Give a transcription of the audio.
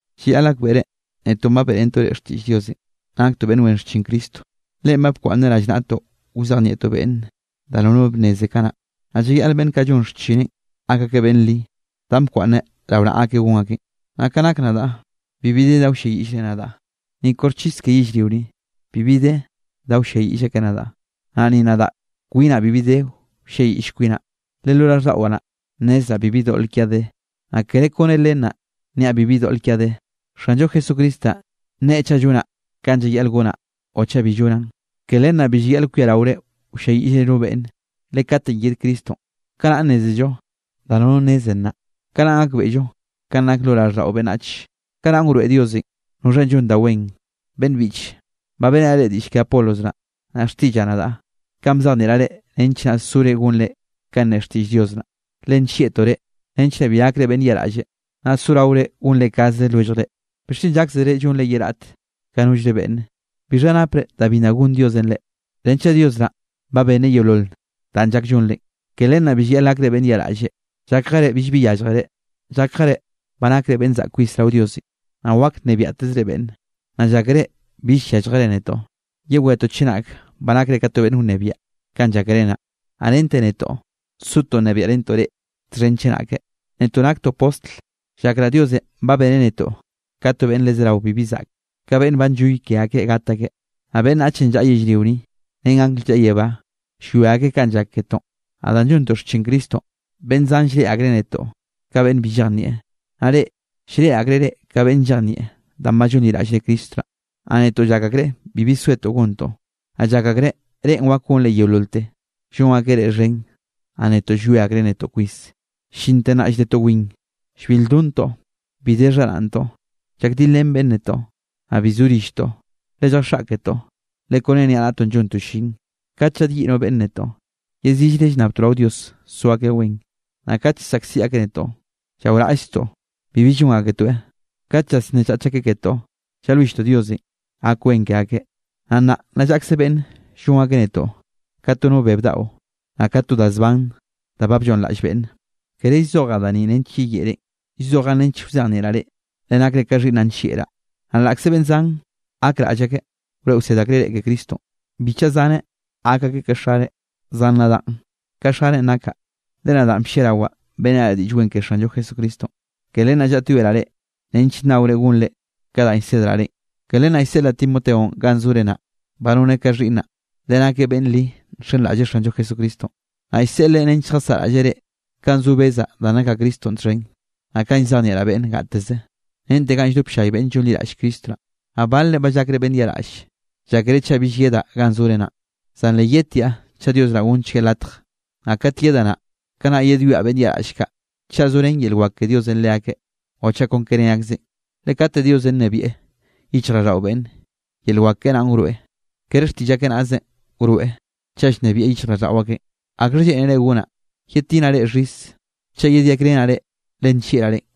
Llayaꞌl gakbeꞌre netoꞌn ba beꞌrentoꞌ reꞌ xtiꞌll Diosenꞌ, naktoꞌ beꞌnn wen xchin Cristo. Leꞌen ba bkwaꞌnneꞌ rallnaꞌtoꞌ wzejnieꞌtoꞌ beꞌnne da nono bnneze kanaꞌ. Naꞌ llayaꞌl beꞌnn kaꞌ llon xchineꞌ gak akeꞌ beꞌnn li, danꞌ bkwaꞌnneꞌ rao naꞌa akeꞌ gon akeꞌn. Naꞌ ka nak nadaꞌ bibi de da wlliayiꞌllre nadaꞌ; ni koxchis ke yellrio ni, bibi de da wlliayiꞌll akeꞌ nadaꞌ, naꞌ ni nadaꞌ kwinaꞌ bibi de wlliayiꞌll kwinaꞌ. Le lo raꞌlldaꞌwaꞌ naꞌ, nnezraꞌ bibi doꞌl kiaꞌ de, naꞌ kere kone len naꞌ niaꞌ bibi doꞌl kiaꞌ de. Xanllo Jesucristo naꞌn nne chaꞌ llonaꞌ kanꞌ llayaꞌl gonaꞌ naꞌ o chaꞌ bi llonaꞌn. Ke len naꞌ bi llayaꞌl kwiaraore wlliayiꞌllre no beꞌnne. Le katenꞌ yed Cristonꞌ, kanaꞌn nnézello da nono nneze nnaꞌ, kanaꞌn gakbeꞌllo kanꞌ nak da yoꞌ lo raꞌlldaꞌo beꞌnnach. Kanaꞌn wroeꞌ Diosenꞌ noxhanꞌ llon da wen naꞌ. Beꞌnn biꞌche, ba beꞌrenaꞌ reꞌ diꞌll ke Apolos naꞌ, naꞌ xtiꞌllaꞌ nadaꞌ, kanꞌ bzejnieꞌraꞌ reꞌ, nench naꞌ sore gonre ka nne xtiꞌll Dios naꞌ, le nllieꞌtoꞌ reꞌ, nench naꞌ bi gakre beꞌnn yaꞌraꞌlle, naꞌ soraore gonre kaze lwelljre. ¿Bixchen llákzere llonllre ye raꞌt ka nollre beꞌnne? ¿Bixha napre da bi nna gonn Diosenꞌ reꞌ? Renchaꞌ Dios naꞌn ba benneꞌ yeolol danꞌ llak llonrenꞌ, ke len naꞌ bi llayaꞌl gakre beꞌnn yaꞌraꞌlle. Llákjere billbi yálljere, llákjere ba nakre beꞌnn zaꞌk kwis rao Diosenꞌ, naꞌ wak nnebiaꞌtezre beꞌnne, naꞌ llákere bill yálljere netoꞌ. Yewejetoꞌ chenak ba nakre ka to beꞌnn wnebiaꞌ kanꞌ llákere naꞌ, naꞌ rente netoꞌ sotoꞌ nnebiaꞌrentoꞌ reꞌ txhen chenake. Netoꞌ naktoꞌ postl, llakraꞌ Diosenꞌ ba beneꞌ netoꞌ ka to beꞌnn le zerawe bibi zaꞌke, ka beꞌnn ba nlloy ke akeꞌ gat akeꞌ. Naꞌ beꞌnnachenꞌ llaꞌa yellrio ni, ren angl llaꞌa yebá, llwia akeꞌ kanꞌ llak ketoꞌn. Naꞌ danꞌ llontoꞌ xchin Cristonꞌ, beꞌnn zan llreꞌe akreꞌ netoꞌ ka beꞌnn bi llejnieꞌ. Naꞌ reꞌ, llreꞌe akreꞌ reꞌ ka beꞌnn llejnieꞌ danꞌ ba llonliraꞌllre Cristo naꞌ, naꞌ netoꞌ llak akreꞌ bibi zoetoꞌ gontoꞌ. Naꞌ llak akreꞌ reꞌn wak gonre yeololte. Llon akeꞌ reꞌ xhen, naꞌ netoꞌ llwie akreꞌ netoꞌ kwis. Llinte nnaꞌ lldetoꞌ win, llbil lldontoꞌ, bi de xharaꞌntoꞌ, llakdilrén beꞌnne netoꞌ, naꞌ bi zo rilltoꞌ. Le lljaxaꞌketoꞌ, le kone niaꞌnaꞌtoꞌn llontoꞌ llin. Kate llaꞌdyiꞌ no beꞌnne netoꞌ, yeziꞌllre llnnabtoꞌ rao Dios so akeꞌ wen, naꞌ kat llsaꞌkziꞌ akeꞌ netoꞌ, llaoraꞌllztoꞌ bibi llon aketoeꞌ. Kat llasnnechach akeꞌ ketoꞌ, llalwilltoꞌ Diosenꞌ gak wen ke akeꞌ. Naꞌ nnaꞌ nna llaꞌkze beꞌnn llon akeꞌ netoꞌ ka to no beb daꞌo, naꞌ ka to da zban da ba blloꞌnnraꞌll beꞌnne. Kere llzojaꞌ da ni nench yeyeꞌrenꞌ, llzojaꞌn nench wzejnieꞌraꞌ reꞌ, le nakre ka xhiꞌnnaꞌ nllieꞌraꞌ. Naꞌ laꞌkze beꞌnn zan gakraꞌll wroeꞌ wsed akreꞌ reꞌ ke Cristonꞌ, bi chaꞌa zaneꞌ gak akeꞌ ka xare. Zan nadaꞌ ka xarenꞌ nakaꞌ, le nadaꞌn blliarawaꞌ beꞌrenaꞌ reꞌ Diꞌll Wen ke Xanllo Jesucristonꞌ. Ke len naꞌ llaꞌtyoeraꞌ reꞌ nench nnaore gonre ka danꞌ llsedraꞌ reꞌn. Ke len naꞌ llseꞌlaꞌ Timoteonꞌ ganꞌ zore naꞌ. Ba noneꞌ ka xhiꞌnnaꞌ, le nakeꞌ beꞌnn li nxenraꞌlleꞌ Xanllo Jesucristonꞌ. Naꞌ llseꞌleꞌ nench lljasaꞌraꞌlleꞌ reꞌ kanꞌ zo bezaꞌ danꞌ nakaꞌ Cristonꞌ txhen, naꞌ kanꞌ llzejnieꞌraꞌ beꞌnn gateze, rente ga lldop ll-llay beꞌnn llonliraꞌll Cristo naꞌ. Naꞌ balre ba llakre beꞌnn yaꞌraꞌll, llákere chaꞌ bill yedaꞌ ganꞌ zore naꞌn. Zan le yedtiaꞌ chaꞌ Dios naꞌ gonnchgueꞌ latje. Naꞌ kat yedaꞌ naꞌ, kanaꞌ yedwiaꞌ beꞌnn yaꞌraꞌll kaꞌ, chaꞌ zorén yel wak ke Diosenꞌ leakeꞌ o chaꞌ kon ke ne akzeꞌn. Le kate Diosenꞌ nnebieꞌ yichjraꞌlldaꞌo beꞌnne, yel wak keꞌe naꞌn wroeꞌ, kere xtiꞌll akeꞌ naꞌzenꞌ wroeꞌ chaꞌ llnebieꞌ yichjraꞌlldaꞌo akeꞌn. ¿Akxhanꞌ lleꞌnere gonaꞌ? ¿Yedtinaꞌ reꞌ xhis, chaꞌ yedyakrenaꞌ reꞌ le nllieꞌraꞌ reꞌn?